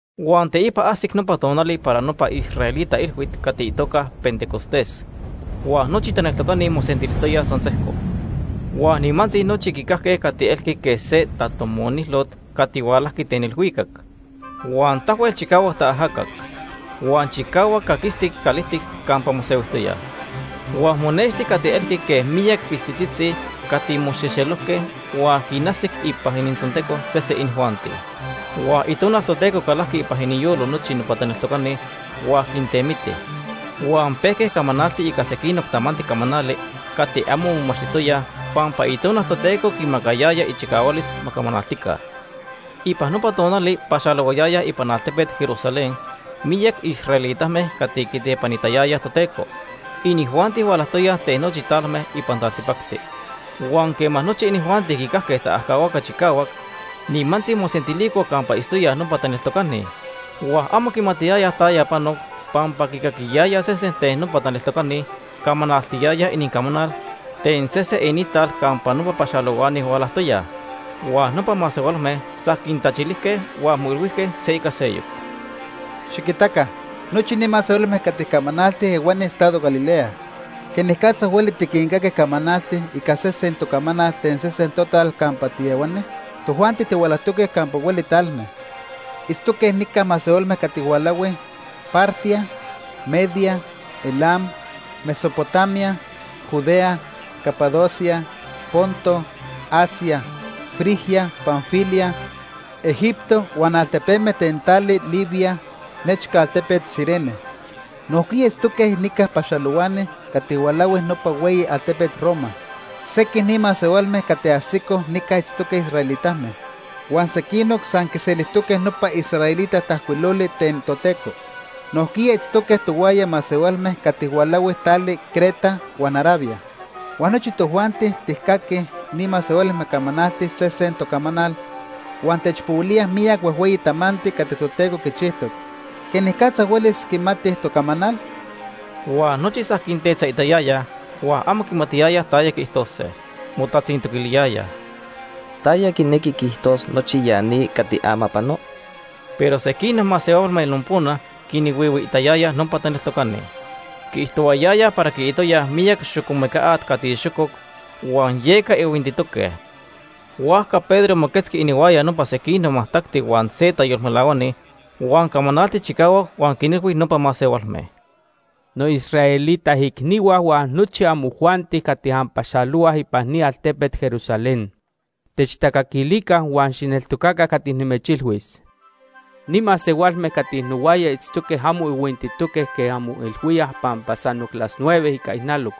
Huan teipa ajsic nopa tonali para nopa israelita ilhuit cati itoca Pentecostés. Huan nochi taneltocani mosentilijtoyaj san sejco. Huan nimantzi nochi quicajque cati elqui quej se tatomonilot cati hualajqui ten ilhuicac. Huan tahuel chicahuac taajacac. Huan chicahuac caquistic calijtic campa mosehuijtoyaj. Huan monexti cati elqui quej miyac piltitzitzi cati moxejxelojque huan quinajsic ipan inintzonteco sese inijuanti. Huan Itonal Toteco calajqui ipan iniyolo nochi nopa taneltocani huan quintemiti. Huan pejque camanaltij ica sequinoc tamanti camanali cati amo momachtijtoyaj pampa Itonal Toteco quinmacayaya ichicahualis ma camanaltica. Ipan nopa tonali paxalohuayayaj ipan altepet Jerusalén miyac israelitame cati quitepanitayayaj Toteco. Inijuanti hualajtoyaj ten nochi talme ipan taltipacti. Huan quema nochi inijuanti quicajque taajcahuaca chicahuac, nimantzi mosentilicoj campa itztoyaj nopa taneltocani. Huan amo quimatiyayaj taya panoc pampa quicaquiyayaj sesen ten nopa taneltocani camanaltiyayaj inincamanal ten sese inintal campa nopa paxalohuani hualajtoyaj. Huan nopa masehualme san quintachilijque huan moilhuijque se ica seyoc: ―Xiquitaca, nochi ni masehualme cati camanaltij ehuani estado Galilea. ¿Quenicatza hueli tiquincaquij camanaltij ica sesen tocamanal ten sesen total campa tiehuani? Tojuanti tihualajtoque campa hueli talme. Itztoque nica masehualme cati hualahui: Partia, Media, Elam, Mesopotamia, Judea, Capadocia, Ponto, Asia, Frigia, Panfilia, Egipto huan altepeme ten tali Libia nechca altepet Cirene. Nojquiya itztoque nica paxalohuani cati hualahui nopa hueyi altepet Roma. Sequij ni masehualme cati ajsicoj nica itztoque israelitame, huan sequinoc san quiselijtoque nopa israelita tajcuiloli ten Toteco. Nojquiya itztoque tohuaya masehualme cati hualahui tali Creta huan Arabia. Huan nochi tojuanti tijcaquij ni masehualme camanaltij sesen tocamanal huan techpohuilía miyac huejhueyi tamanti cati Toteco quichijtoc. ¿Quenicatza huelis quimatij tocamanal? Huan nochi san quintetzaitayayaj huan amo quimatiyayaj taya quiijtose. Motatzintoquiliyayaj: ―¿Taya quinequi quiijtos nochi ya ni cati ama pano? Pero sequinoc masehualme nopona quinhuihuiitayayaj nopa taneltocani. Quiijtohuayayaj para quiitoyaj miyac xocomeca at cati xococ huan yeca ihuintitoque. Huajca Pedro moquetzqui inihuaya nopa sequinoc majtacti huan se tayolmelahuani, huan camanaltic chicahuac huan quinilhui nopa masehualme: “Noisraelita icnihua huan nochi amojuanti cati anpaxalohuaj ipan ni altepet Jerusalén, techtacaquilica huan xijneltocaca cati nimechilhuis. Ni masehualme cati nohuaya itztoque amo ihuintitoque quej anmoilhuíaj pampa sanoc las nueve ica ijnaloc.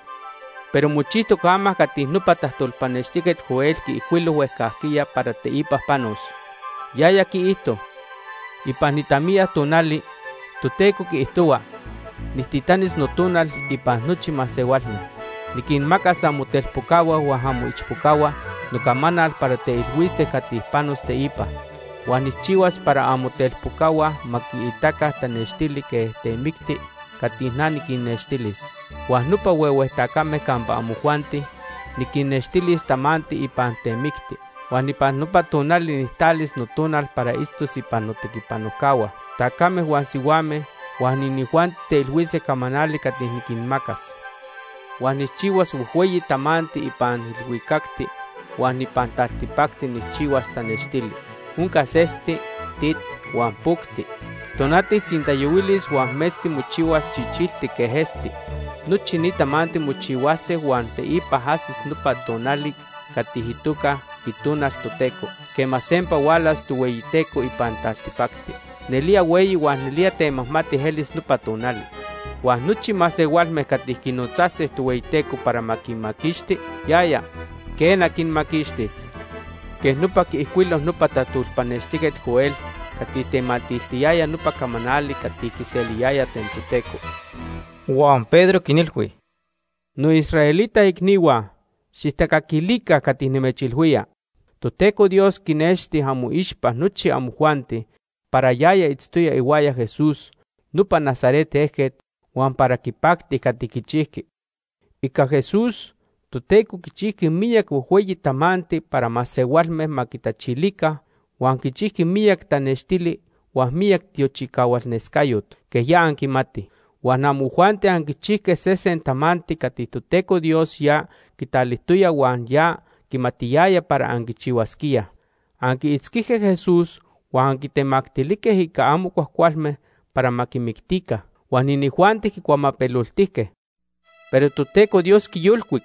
Pero mochijtoc ama cati nopa tajtolpanextijquet Joel quiijcuilo huejcajquiya para teipa panos. Yaya quiijto: ‘Ipan itamiya tonali, Toteco quiijtohua, nijtitanis Notonal ipan nochi masehualme. Niquinmacas amotelpocahua huan amoichpocahua nocamanal para teilhuise cati panos teipa. Huan nijchihuas para amotelpocahua ma quiitaca tanextili quej temicti cati na niquinnextilis, huan nopa huehue tacame campa amojuanti, niquinnextilis tamanti ipan temicti. Huan ipan nopa tonali nijtalis noTonal para itztos ipan notequipanojcahua, tacame huan sihuame, huan inijuanti teilhuise camanali cati niquinmacas. Huan nijchihuas huejhueyi tamanti ipan ilhuicacti. Huan ipan taltipacti nijchihuas tanextili. Oncas esti, tit huan pocti. Tonati tzintayohuilis huan metzti mochihuas chichiltic quej esti. Nochi ni tamanti mochihuase huan teipa ajsis nopa tonal cati itoca “itonal Toteco” quema sempa hualas Tohueyiteco ipan taltipacti. Nelía hueyi huan nelía temajmati elis nopa tonal. Huan nochi masehualme cati quinotzase Tohueyiteco para ma quinmaquixti, yaya, quena, quinmaquixtis.’ Quej nopa quiijcuilo nopa tajtolpanextijquet Joel cati tematiltiyaya nopa camanali cati quiseliyaya ten Toteco.” Huan Pedro quinilhui: “Noisraelita icnihua, xijtacaquilica cati nimechilhuía. Toteco Dios quinexti amoixpa nochi amojuanti para yaya itztoya ihuaya Jesús, nopa Nazaret ejquet, huan para quipacti cati quichijqui. Ica Jesús, Toteco quichijqui miyac huejhueyi tamanti para masehualme ma quitachilica huan quichijqui miyac tanextili huan miyac tiochicahualnescayot, quej ya anquimatij. Huan amojuanti anquichijque sesen tamanti cati Toteco Dios ya quitalijtoya huan ya quimatiyayaj para anquichihuasquíaj. Anquiitzquijque Jesús huan anquitemactilijque ica amo cuajcualme para ma quimictica. Huan inijuanti quicuamapeloltijque. Pero Toteco Dios quiyolcuic.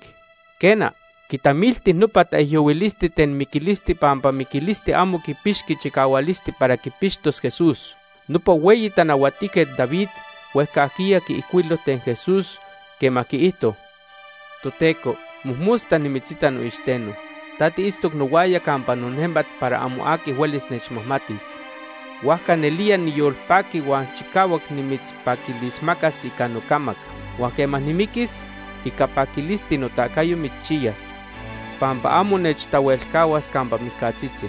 Quena, quitamilti nopa taijyohuilisti ten miquilisti pampa miquilisti amo quipixqui chicahualisti para quipixtos Jesús. Nopa hueyi tanahuatijquet David huejcajquiya quiijcuilo ten Jesús quema quiijto: ‘Toteco, mojmosta nimitzita noixteno. Ta tiitztoc nohuaya campa nonejmat para amo aqui huelis nechmajmatis. Huajca nelía niyolpaqui huan chicahuac nimitzpaquilismacas ica nocamac. Huan quema nimiquis, ica paquilisti notacayo mitzchiyas. Pampa amo nechtahuelcahuas campa mijcatzitzi,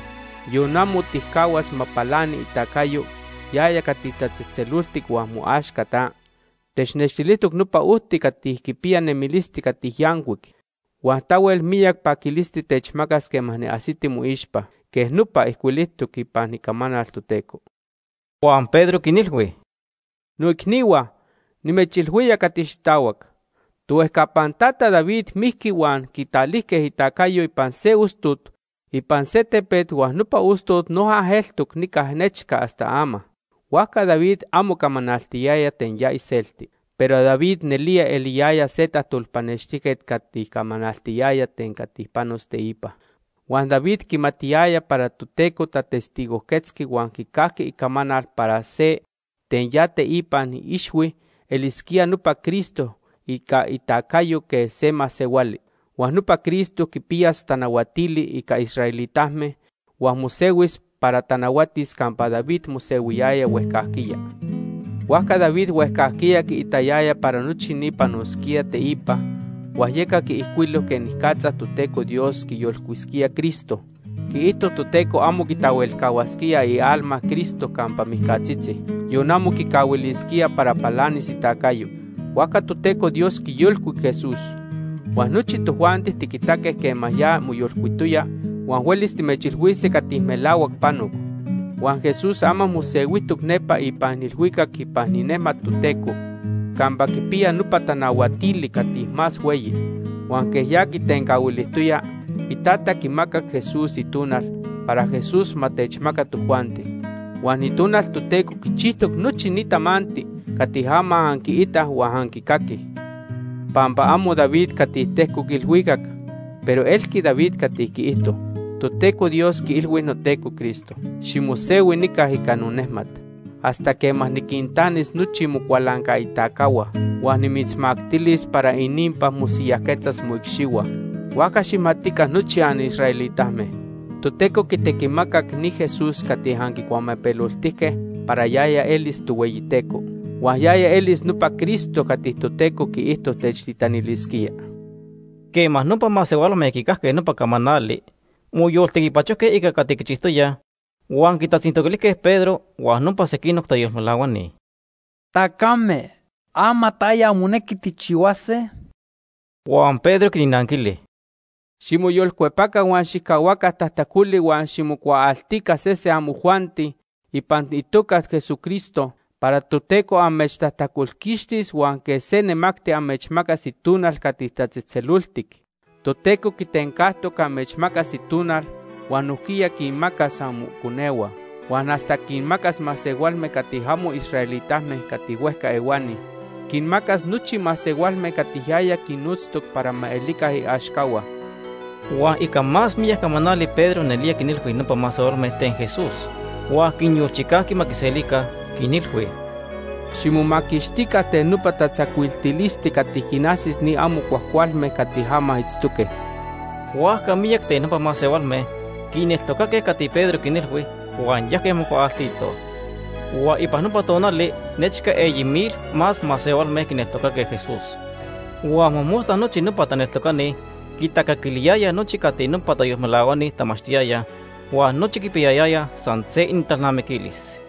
yon amo tijcahuas ma palani itacayo yaya cati tatzetzeloltic huan moaxca ta. Technextilijtoc nopa ojti cati quipiya nemilisti cati yancuic, huan tahuel miyac paquilisti techmacas quema niajsiti moixpa.’ Quej nopa ijcuilijtoc ipan icamanal Toteco.” Huan Pedro quinilhui: “Noicnihua, nimechilhuía cati xitahuac. Tohuejcapan tata David mijqui huan quitalijque itacayo ipan se ostot ipan se tepet huan nopa ostot noja eltoc nica nechca hasta ama. Huajca David amo camanaltiyaya ten ya iselti. Pero David nelía eliyaya se tajtolpanextijquet cati camanaltiyaya ten cati panos teipa. Huan David quimatiyaya para Toteco tatestigojquetzqui huan quicajqui icamanal para se ten ya iteipan ixhui elisquía nopa Cristo ica itacayo quej se masehuali. Huan nopa Cristo quipiyas tanahuatili ica israelitame huan mosehuis para tanahuatis campa David mosehuiyaya huejcajquiya. Huajca David huejcajquiya quiitayaya para nochi ni panosquía teipa huan yeca quiijcuilo quenicatza Toteco Dios quiyolcuisquía Cristo. Quiijto Toteco amo quitahuelcahuasquía ialma Cristo campa mijcatzitzi, yon amo quicahuilisquía para palanis itacayo. Huajca Toteco Dios quiyolcuic Jesús, huan nochi tojuanti tiquitaque quema ya moyolcuitoya huan huelis timechilhuise cati melahuac panoc. Huan Jesús ama mosehuijtoc nepa ipan ilhuicac ipan inejmat Toteco campa quipiya nopa tanahuatili cati más hueyi. Huan quej ya quitencahuilijtoya, Itata quimacac Jesús Itonal para Jesús ma techmaca tojuanti. Huan Itonal Toteco quichijtoc nochi ni tamanti cati ama anquiitaj huan anquicaquij. Pampa amo David cati tejcoc ilhuicac, pero elqui David cati quiijto: ‘Toteco Dios quiilhui noTeco Cristo: Ximosehui nica ica nonejmat, hasta quema niquintanis nochi mocualancaitacahua, huan nimitzmactilis para ininpa mosiyajquetzas moicxihua.’ “Huajca xijmatica nochi anisraelitame, Toteco quitequimacac ni Jesús cati anquicuamapeloltijque para yaya elis Tohueyiteco. Huan yaya elis nopa Cristo cati Toteco quiijto techtitanilisquía.” Quema nopa masehualme quicajque nopa camanali, moyoltequipachojque ica cati quichijtoyaj, huan quitatzintoquilijque Pedro huan nopa sequinoc tayolmelahuani: ―Tacame, ama ¿taya monequi tijchihuase? Huan Pedro quinnanquili: ―Ximoyolcuepaca huan xijcahuaca tajtacoli huan ximocuaaltica sese amojuanti ipan itoca Ica itequiticayo. Jesucristo para Toteco amechtajtacolquixtis huan quej se nemacti amechmacas Itonal cati tatzejtzeloltic. Toteco quitencajtoc amechmacas Itonal huan nojquiya quinmacas amoconehua, huan hasta quinmacas masehualme cati amo israelitame cati huejca ehuani. Quinmacas nochi masehualme cati yaya quinnotztoc para ma elica iaxcahua. Huan ica más miyac camanali Pedro nelía quinilhui nopa masehualme ten Jesús huan quinyolchicajqui ma quiselica, quinilhui: ―Ximomaquixtica ten nopa tatzacuiltilisti cati quinajsis ni amo cuajcualme cati ama itztoque. Huajca miyac ten nopa masehualme quineltocaque cati Pedro quinilhui, huan yajque mocuaaltitoj. Huan ipan nopa tonali nechca eyi mil más masehualme quineltocaque Jesús. Huan mojmosta nochi nopa taneltocani quitacaquiliyayaj nochi cati nopa tayolmelahuani tamachtiyayaj huan nochi quipiyayayaj san se inintalnamiquilis.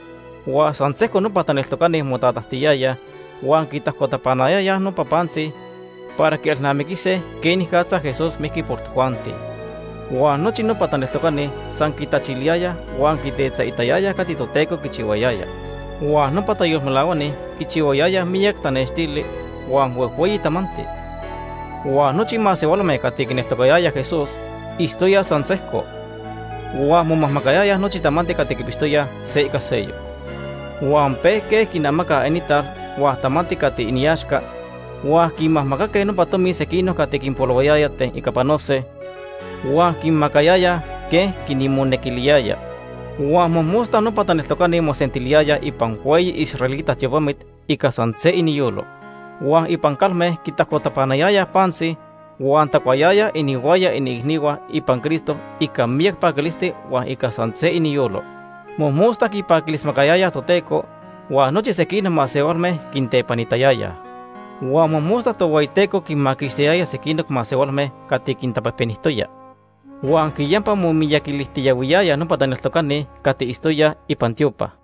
Huan san sejco nopa taneltocani motatajtiyayaj huan quitajcotapanayayaj nopa pantzi para quielnamiquise quenicatza Jesús mijqui por tojuanti. Huan nochi nopa taneltocani san quitachiliyayaj huan quitetzaitayayaj cati Toteco quichihuayaya. Huan nopa tayolmelahuani quichihuayayaj miyac tanextili huan huejhueyi tamanti. Huan nochi masehualme cati quineltocatoyaj Jesús itztoyaj san sejco. Huan momajmacayayaj nochi tamanti cati quipixtoyaj se ica seyoc. Huan pejque quinamacaj inintal huan tamanti cati iniaxca huan quinmajmacaque nopa tomi sequinoc cati quinpolohuayaya ten ica panose huan quinmacayayaj quej quinmonequiliyaya. Huan mojmosta nopa taneltocani mosentiliyayaj ipan hueyi israelita tiopamit ica san se iniyolo. Huan ipan calme quitajcotapanayayaj pantzi, huan tacuayayaj ihuaya iniicnihua ipan Cristo ica miyac paquilisti huan ica san se iniyolo. Mojmosta quipaquilismacayayaj Toteco, huan nochi sequinoc masehualme quintepanitayayaj. Huan mojmosta Tohueyiteco quinmaquixtiyaya sequinoc masehualme cati quintapejpenijtoya. Huan quiyampa momiyaquilijtiyahuiyayaj nopa taneltocani cati itztoyaj ipan itiopa.